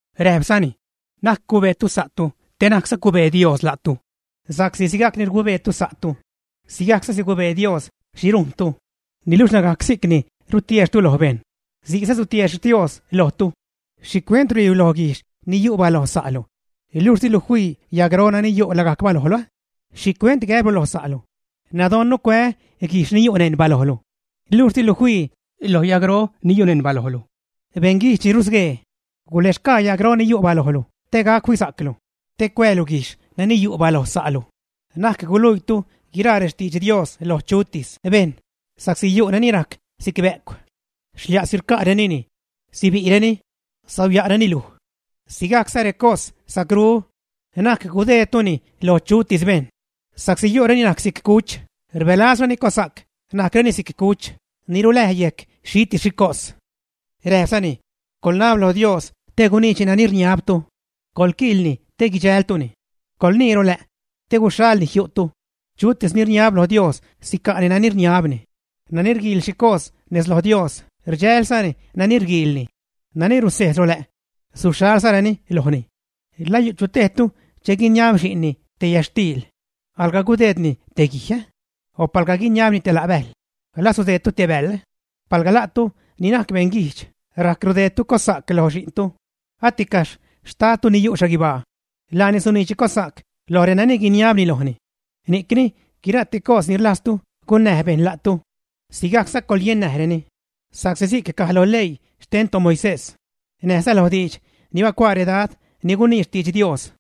Räjpzani: ―Na'c cubeetu sa'tu te na'cza cubee Dios la'tu. Sa'csi sigacni rgubeetu sa'tu, sigajcza sigubee Dios xhi rujntu; niluxh lagajc si'cni rutiexhtu lo bejṉ, si'cza sutiexh Dios lojtu. ¿Xhicuent ruhuiilu loj guijxh ni yu' baloj sa'lu, luxh dilu fii yagro nani yu' lagajc balojlu? ¿Xhicuent gäblu lo sa'lu, nädoṉnu cuää́ guijxh ni yu' neṉ balojlu, luxh dilu fii loj yagro ni yu' neṉ balojlu? Beṉguijdx ni rusguee, guläxgaa yagro ni yu' balojlu te gac fisa'clu te cuäälu guijxh nani yu' baloj sa'lu. ’Na'c guluiitu guiraa rextidx Dios loj chutis bejṉ sa'csi yu'reni najc si'c bä'cw, xlia'si rca'renini; sibi'reni, sauya'reni luj. Sigajcza recos sa'cru, na'c gudeedtuni loj chutis bejṉ, sa'csi yu'reni najc si'c cuch rbälazreni cossa'c najcreni si'c cuch ni ruläj yejc xhitis xhi cos. Räjpzani: ―Coḻnab lo Dios te guniidxni nani rniabtu. Coḻquiilni te guidxäjltuni. Coḻnii rolä', te guixalni jiu'tu. Chutis ni rniab lo Dios sica'ni nani rniabni, nani rguiil xhi cos nez loj Dios rdxälzani nani rguiilni; nani rusejz rolä', suxhalzareni lojni. ’¿La yu' chu tejtu che guiniab xi'nni te yätxtiil, alga gudeedni te guij, ä? O palga guiniabni te la' bäjl, ¿la sudeedni te bäḻ? Palga la'tu ni najc beṉ guijdx rajc rudeedtu cossa'c loj xi'ntu, aticaxh xtadtu ni yu' xhaguibaa. Laani suniidxni cossa'c loj renani guiniabni lojni. ’Ni'cni guira'ti cos ni rlajztu gunnäj bejṉ la'tu, sigajcza coḻyennäjreni, sa'csi si'c caj lo leii xten toMoisés, näjza lo diidx ni bacuaa redad ni gunii xtidx Dios.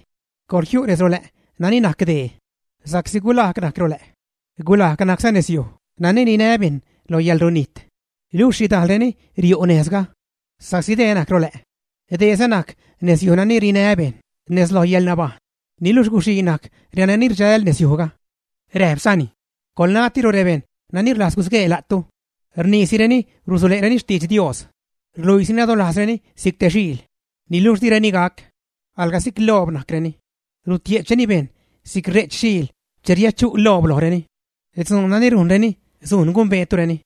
’Coḻjiu' nez rolä' nani najc dää, sa'csi gulajg najc rolä', gulajg najcza nezyuj nani rinä bejṉ lo yäḻrunijt, luxh xhidajlreni riu' nejzga. Sa'csi dää najc rolä', dääza najc nezyuj nani rinä bejṉ nez loj yäḻnabajṉ, niluxh guxii najc renani rdxäl nezyujga. Räjpzani: ―Coḻnatiro rebejṉ nani rlajz gusguee la'tu. Rniisireni rusule'reni xtidx Dios. Rluiisi nadolajzreni si'c te xiil, niluxh direni gac. Alga si'c loob najcreni, rutie'chreni bejṉ si'c re'ch xiil che riädchu' loob lojreni. Dzuun nani rujnreni sujn gumbeetureni.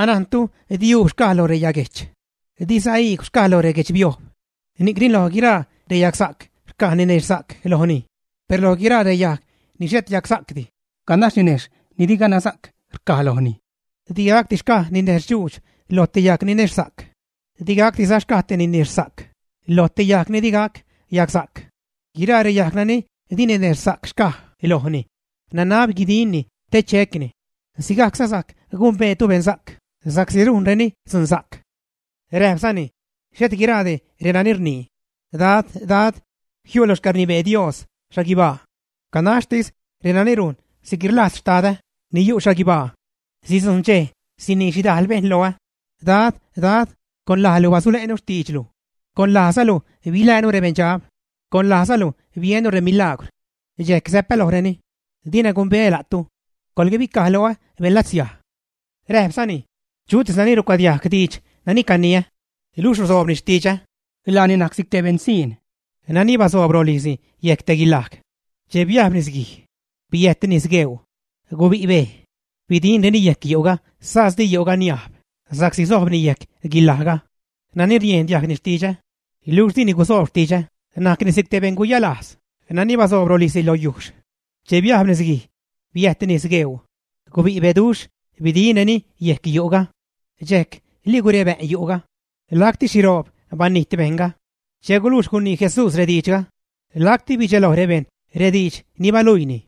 Anajntu di uub xcaj lo reyaguejch, diza iigw xcaj lo guechbiojb. Ni'cni lo guiraa reyagsa'c rcaj ninexhsa'c lojni, per lo guiraa reyajg ni xhet yagsa'cdi, ganax ninejxh ni di ganaxsa'c rcaj lojni. Digacdi xcaj ninexhdxuudx loj te yajg ninexhsa'c. Di gacdiza xcaj te ninexhsa'c loj te yajg ni di gac yagsa'c. Guiraa reyajg nani di ninexhsa'c xcaj lojni, nanab guidinni te checni. Sigajcza sajc gumbeetu beṉsa'c sa'csi rujnreni dzunsa'c. Räjpzani: ―Xhet guiraadi renani rnii, “Dad, Dad”, jiu' lo xcäḻrnibee Dios xhaguibaa. Ganaxtis renani rujn si'cni rlajz Xtadä ni yu' xhaguibaa. Sidzujṉ dxej sinii xhidajl bejṉ loä: “Dad, Dad, con lajlu basule'nu xtiidxlu, con lajzalu biläänu rebeṉdxab, con lajzalu biennu remilagwr.” Dxejc säpä lojreni: “Dina gumbeä la'tu. Coḻbicaj loä beṉlatsiaj.” Räjpzani: ―Chutis nani rucuadiajg diidx nani caniä, luxh ruzoob xtidxä, laani najc si'c te beṉsiṉ nani basoob rolijzni yejc te guilaj. Che biajb nisguij, biäjt nis gueuu, gubi' bej, bidinreni yejc yu'ga sas di yu'ga niajb sa'csi sojbni yejc guilajga. Nani riejn diajgni xtidxä, luxh dini guzoob xtidxä najc si'c te beṉ guyalajz nani basoob rolijzni lo yujxh. Che biajb nisguij, biäjt nis gueuu, gubi' beduxh bidinreni yec yu'ga. Dxejc ligurebä'n yu'ga. Lacti xhiroob banijt bejṉga. Che gulujx gunii Jesús rediidxga, lacti bidxeloj rebejṉ rediidx ni baluiini,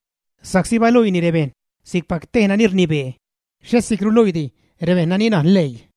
sa'csi baluiini rebejṉ si'cpac te nani rnibee, xhet si'c ruluiidi rebejṉ ni najn leii.